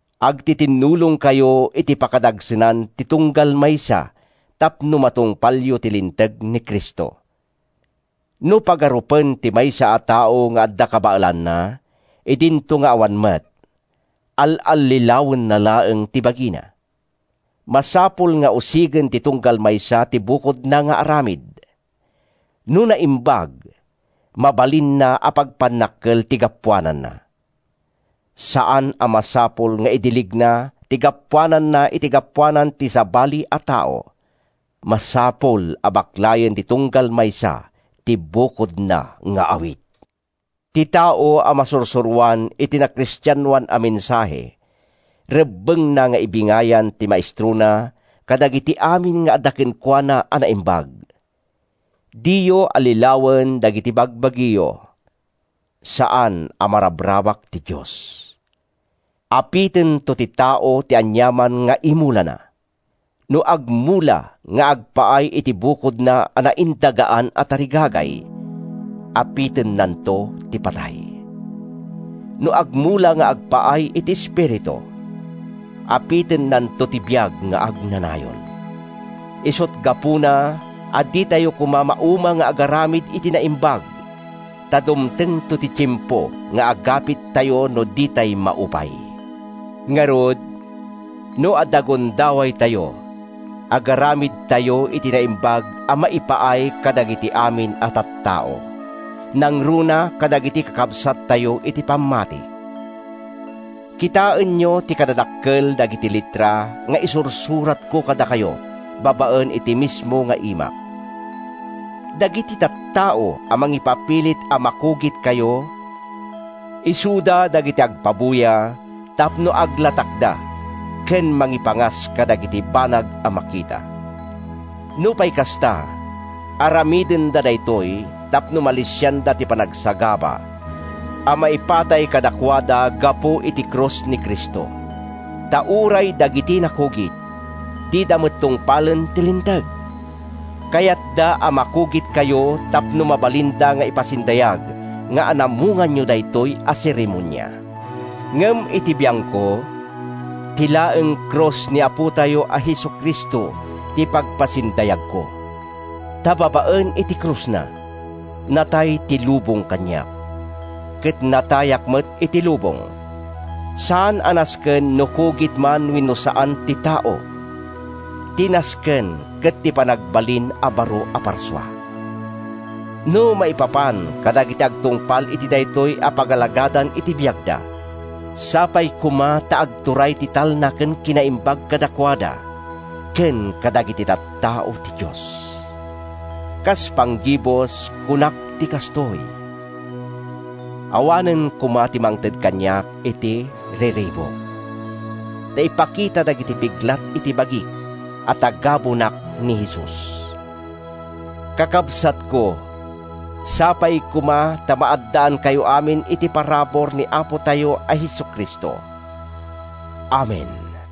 Agtitinnulongkayo iti pakadagsenan ti tunggal maysa tapno matungpalyo ti linteg ni Cristo. No pagarupen ti maysa a tao nga adda kabaelanna, idinto nga awan met, al-allilawenna laeng ti bagina. Masapul nga usigen ti tunggal maysa ti bukodna nga aramid. No naimbag, mabalinna a pagpannakkel ti gapuananna. Saan a masapul nga idiligna ti gapuananna iti gapuanan ti sabali a tao. Masapul a baklayen ti tunggal maysa ti bukodna nga awit. Ti tao a masursuroan iti nakristianoan a mensahe, rebbengna nga ibingayan ti maestrona kadagiti amin nga adda kenkuana a naimbag. Diyo allilawen dagiti bagbagiyo; saan a marabrabak ti Dios. Apitento ti tao ti aniaman nga imulana. No agmula nga agpaay iti bukodna a naindagaan a tarigagay, apitennanto ti patay. No agmula nga agpaay iti Espiritu, apitennanto ti biag nga agnanayon. Isut’ gapuna a ditayo koma mauma nga agaramid iti naimbag; ta dumtengto ti tiempo nga agapittayo no ditay maupay. Ngarud, no adda gundawaytayo, agaramidtayo iti naimbag a maipaay kadagiti amin a tattao, nangruna kadagiti kakabsatyo iti pammati. Kitaenyo ti kadadakkel dagiti letra nga isursuratko kadakayo babaen iti mismo nga imak! Dagiti tattao a mangipapilit a makugitkayo isuda dagiti agpabuya tapno aglatakda ken mangipangas kadagiti banag a makita. Nupay kasta, aramidenda daytoy tapno malisianda ti panagsagaba a maipatay kadakuada gapu iti krus ni Cristo. Ta uray dagiti nakugit, dida met tungpalen ti Linteg; kayatda a makugitkayo tapno mabalinda nga ipasindayag nga anamonganyo daytoy a seremonia. Ngem iti biangko, ti laeng krus ni Apotayo a Jesu-Cristo ti pagpasindayagko; ta babaen iti krusna, natay ti lubong kaniak, ket natayak met iti lubong. Saan a nasken no kugit man wenno saan ti tao; ti nasken ket ti panagbalin a baro a parsua. No maipapan kadagiti agtungpal iti daytoy a pagalagadan iti biagda, sapay koma ta agturay ti talna ken kinaimbag—kadakuada ken kadagiti tattao ti Dios! Kas panggibus, kunak ti kastoy: awanen koma ti mangted kaniak iti riribuk ta ipakita dagiti piglat iti bagik a tagabunak ni Jesus. Kakabsatko, sapay koma ta maaddaankayo amin iti parabur ni Apotayo a Jesu-Cristo. Amen.